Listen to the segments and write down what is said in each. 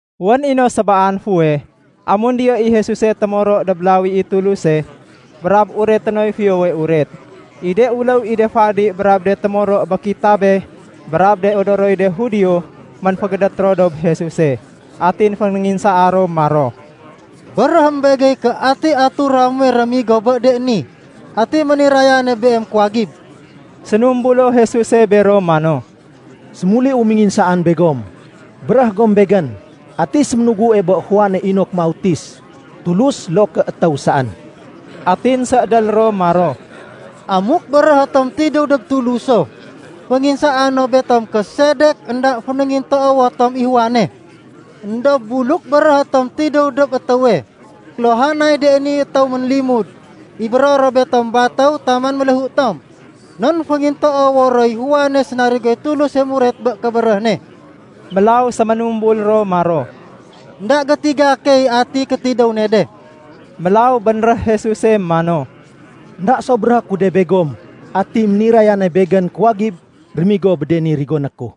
Wén i no sébaan fuweh, amun diyo i Jesuse témoro dob lawi i Tuluse, brab ureté noy Fiyowe Uret, i de uléw i de fadi brab de témoro bé kitabé brab de odoroy de Judio, ménfégédét ro dob Jesuse. Atin fénénginsaa ro maro, “Béréhém begey ké ati atura muwe rémigo bé de ni? Ati ménirayane Beem kuwagib?” Sénumbulo Jesuse bero mano, “Sémuliu ménginsaan begom. Béréh gom Begén, ati séménugue bé Juane inok mautis, Tulus loo ké étéw saén?” Atin séédél ro maro, “Amuk béréhé tom ‘Tidéw dob Tuluso’, fénginsaa no betom ké sedek énda fénéngintoowo tom i Juane. Endob buluk béréh tom ‘Tidéw dob étéwe’, kéluhanay de ni étéw ménlimud, ibéro ro betom batéw taman méléhu tom, non féngintoowo roy Juane sénarigoy Tuluse muret bé kébéréh ne.” Mélaw séménumbul ro maro, “Enda gétiga key ati kétidéw ne de.” Mélaw bénréh Jesuse mano, “Enda so béréhé ku de begom ati ménirayane Begén kuwagib rémigo bé de ni rigoné ku.”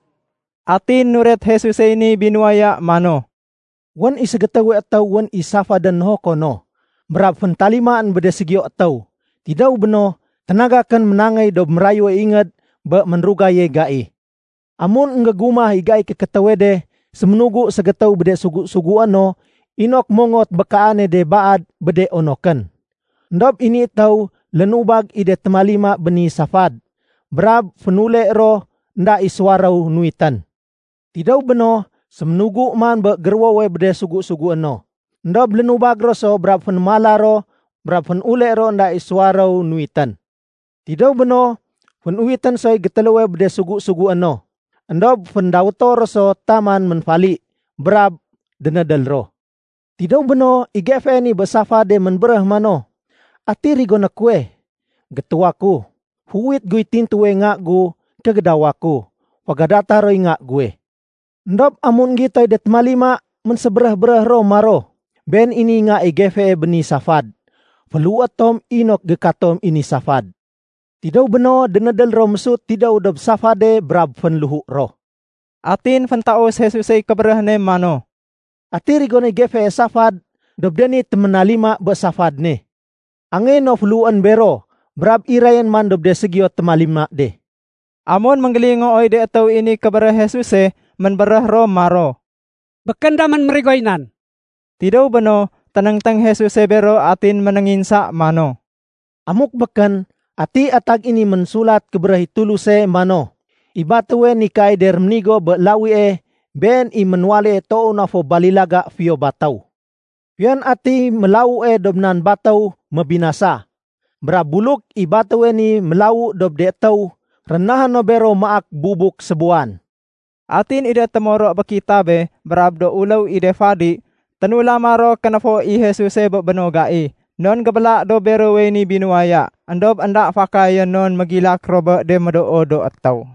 Atin nuret Jesusey ni binuwaya mano, “Wén i ségétéwe étéw wén i safadén nohoko no. Brab féntalimaén bé de ségiyo étéw. Tidéw béno, ténagakén ménangéy dob mérayue ingéd bé ménrugaye gai. Amun énggégumah i gaiy kékétéwe de, séménugu ségétéw bé de sugu-sugué no inok mongot bé kaane de baad bé de onokén. Endob i ni étéw lénubag i de témalima bé ni safad. Brab fénule ro énda i suwaréw nuwitén. Tidéw béno, séménugu man bé géruwowe bé de sugu-sugué no. Endob lénubag ro so brab fénémala ro brab fénule ro énda i suwaréw nuwitén. Tidéw béno, fénuwitén soy gétéléwe bé de sugu-sugué no. Endob féndawéto ro so taman ménfali. Brab dénédél ro. Tidéw béno, i gefee bé ni safad ménbéréh mano, ‘Ati rigoné kuwe? Gétuwa ku. Féuwit guy tintuwe nga gu kégédawa ku. Fégadata roy nga guwe.’ Endob amun énggitoy de témalima, ménsébéréh-béréh ro maro, ‘Been i niy nga i gefee bé ni safad. Féléhué tom inok gékatom i ni safad.’ Tidéw béno, dénédél ro mésut tidéw dob safade brab fénléhu ro.” Atin féntaus Jesusey kébéréh ne mano, “Ati rigonéy gefee safad dob de ni téménalima bé safad ne? Angéyé no féléhuén bero. Brab irayén man dob de ségiyo témalima de.” Amun énggélingooy de étéw i ni kébéréh Jesuse, ménbéréh ro maro, “Békén damén mérigoy nan.” Tidéw béno, ténéngténg Jesuse bero atin ménénginsa mano, “Amuk békén, ati atag i ni Ménsulat Kébéréh i Tuluse mano ‘I batéwe nikaay de réménigo bé lawie, been i ménwaléye toow na fo balilaga fiyo batéw’? Fiyon atiy mélawue dob nan batéw mébinasa. Brab buluk i batéwe ni mélawu dob de étéw, rénahé no bero maak bubuk sébuwan.” Atin i de témoro bé kitabé brab do uléw i de fadi, ténulama ro kénéfo i Jesuse bé béno gai, non gébéla dob berowey ni binuwaya. Endob énda fakayén non mégilak ro bé de médoo do étéw.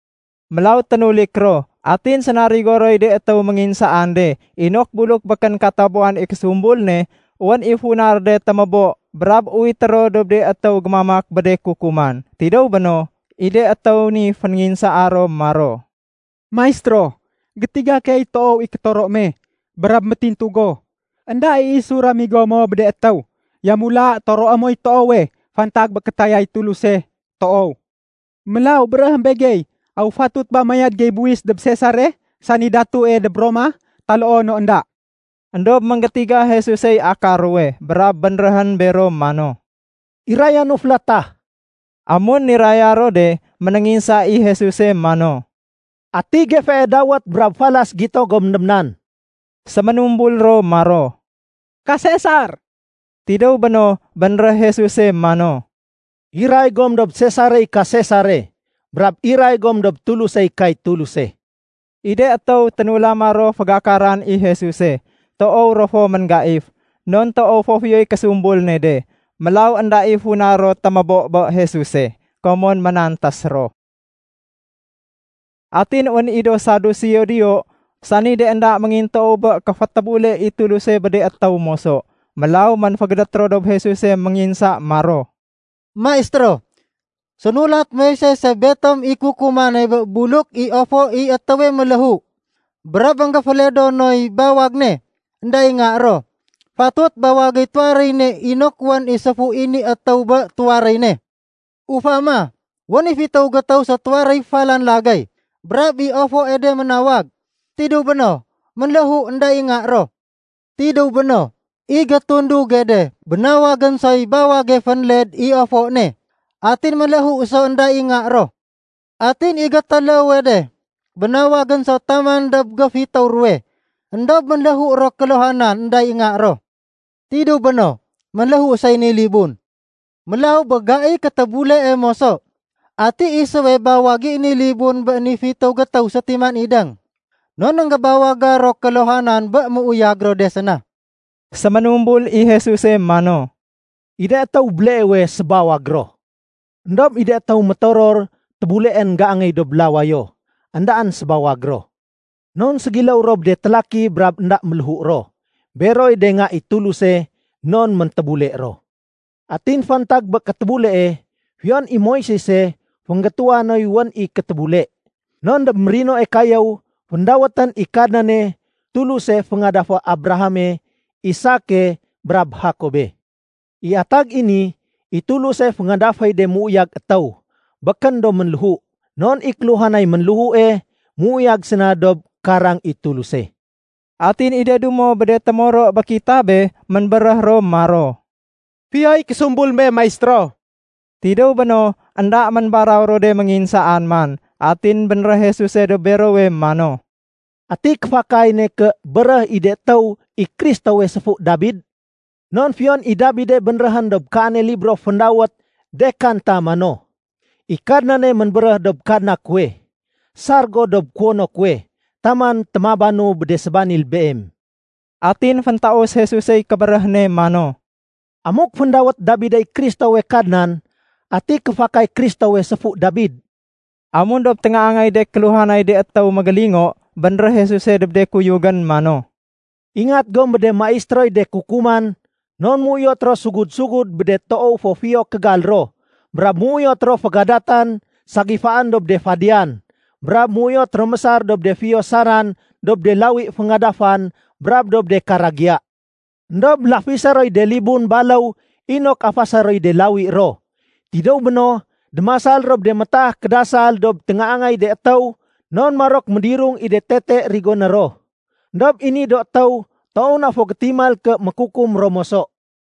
Mélaw ténulik ro. Atin sénarigo roy de étéw ménginsaan de inok buluk békén katabuwan i késumbul ne, wén i funa ro de témébo brab uwité ro dob de étéw gémamak bé de kukuman. Tidéw béno, i de étéw ni fénginsaa ro maro, “Maistéro, gétiga key toow i kétoro me. Brab métintu go, énda i isu ramigo mo bé de étéw. Yamula toroé moy toowe fantag bé kétayay Tuluse toow. Mélaw béréhém begey, aw fatut ba mayad gey buwis dob Sesare sani datue dob Roma taloo no énda?” Endob énggétiga Jesusey akar ruwe brab bénréhén bero mano, “Irayanu félatah.” Amun niraya ro de, ménénginsa i Jesuse mano, “Ati gefee dawét brab falas gito gom dob nan?” Séménumbul ro maro, “Ka Sesar.” Tidéw béno, bénréh Jesuse mano, “Iray gom dob Sesarey ka Sesare. Brab iray gom dob Tulusey kay Tuluse.” I de étéw ténulama ro fégakaran i Jesuse, toow ro fo ménggaif, non toow fo fiyoy késumbul ne de. Mélaw énda i funa ro témébo bé Jesuse. Komon ménantés ro. Atin wén i do Saduseo diyo, sani de énda méngintoow bé kéfétébule i Tuluse bé de étéw moso. Mélaw ménfégédét ro dob Jesuse ménginsa maro, “Maistéro, sénulat Moisese betom i kukumane bé buluk i ofo i étéwe ménléhu, brab énggéféledo noy bawag ne, énda i nga ro, fatut bawagéy tuwaréy ne inok wén i séfu i ni étéw bé tuwaréy ne. Ufama, wén i fitéw gétéw sétuwaréy falan lagéy. Brab i ofoe de ménawag. Tidéw béno, ménléhu énda i nga ro. Tidéw béno, i gétunduge de bénawagén soy bawage fénled i ofo ne. Atin ménléhu so énda i nga ro. Atin i gétéléwe de bénawagén so taman dob géfitéw ruwe. Endob ménléhu ro kéluhanan énda i nga ro. Tidéw béno, ménléhu soy ni libun. Mélaw bé gaiy kétébulee moso, ati isuwe bawag i ni libun bé ni fitéw gétéw sétiman idéng? Non énggébawaga ro kéluhanan bé méuyag ro de séna.” Séménumbul i Jesuse mano, “I de étéw béleewe, sébawag ro. Endob i de étéw métoror tébuleén géangéy dob lawayo, éndaén sébawag ro. Non ségiléw ro bé de télaki brab énda méléhu ro. Beroy de nga i Tuluse non méntébule ro. Atin fantag bé kétébulee, fiyon i Moisese fénggétuwa noy wén i kétébule. Non dob mérinoe kayéw, féndawétén i Kadnane ‘Tuluse féngadafé Abrahame, Isake, brab Jakobe.’ I atag i ni, i Tuluse féngadaféy de méuyag étéw, békén do ménléhu. Non i kéluhanay ménléhue, méuyag séna dob karang i Tuluse.” Atin i de dumo bé de témoro bé kitabé ménbéréh ro maro, “Fiyoy késumbul me Maistéro.” Tidéw béno, énda ménbaraw ro de ménginsaan man. Atin bénréh Jesuse dob berowe mano, “Ati kéfakay ne ké béréh i de étéw i Kristowe séfu Dabid? Non fiyon i Dabide bénréhén dob kaane libro féndawét ‘De Kanta’ mano, ‘I Kadnane ménbéréh dob Kadna kuwe, sar go dob kuwono kuwe, taman témabanu bé de sébanil Beem.’” Atin féntaus Jesusey kébéréh ne mano, “Amuk féndawét Dabidey Kristowe ‘Kadnan’, ati kéfakay Kristowe séfu Dabid?” Amun dob téngaangay de kéluhanay de étéw mégélingo, bénréh Jesuse dob de kuyugén mano, “Ingat gom bé de maistéroy de kukuman non méuyot ro sugud-sugud bé de toow fo fiyo kégal ro, brab méuyot ro fégadatan ségifaén dob de fadiyan, brab méuyot ro mésar dob de fiyo saran dob de lawi féngadafan brab dob de karagiya. Endob lafisé roy de libun baléw inok afasé roy de lawi ro. Tidéw béno, démasal ro bé de métaah kédasal dob téngaangay de étéw non marok médirung i de ni tete rigoné ro. Endob i ni do étéw toow na fo gétimal ké mékukum ro moso.”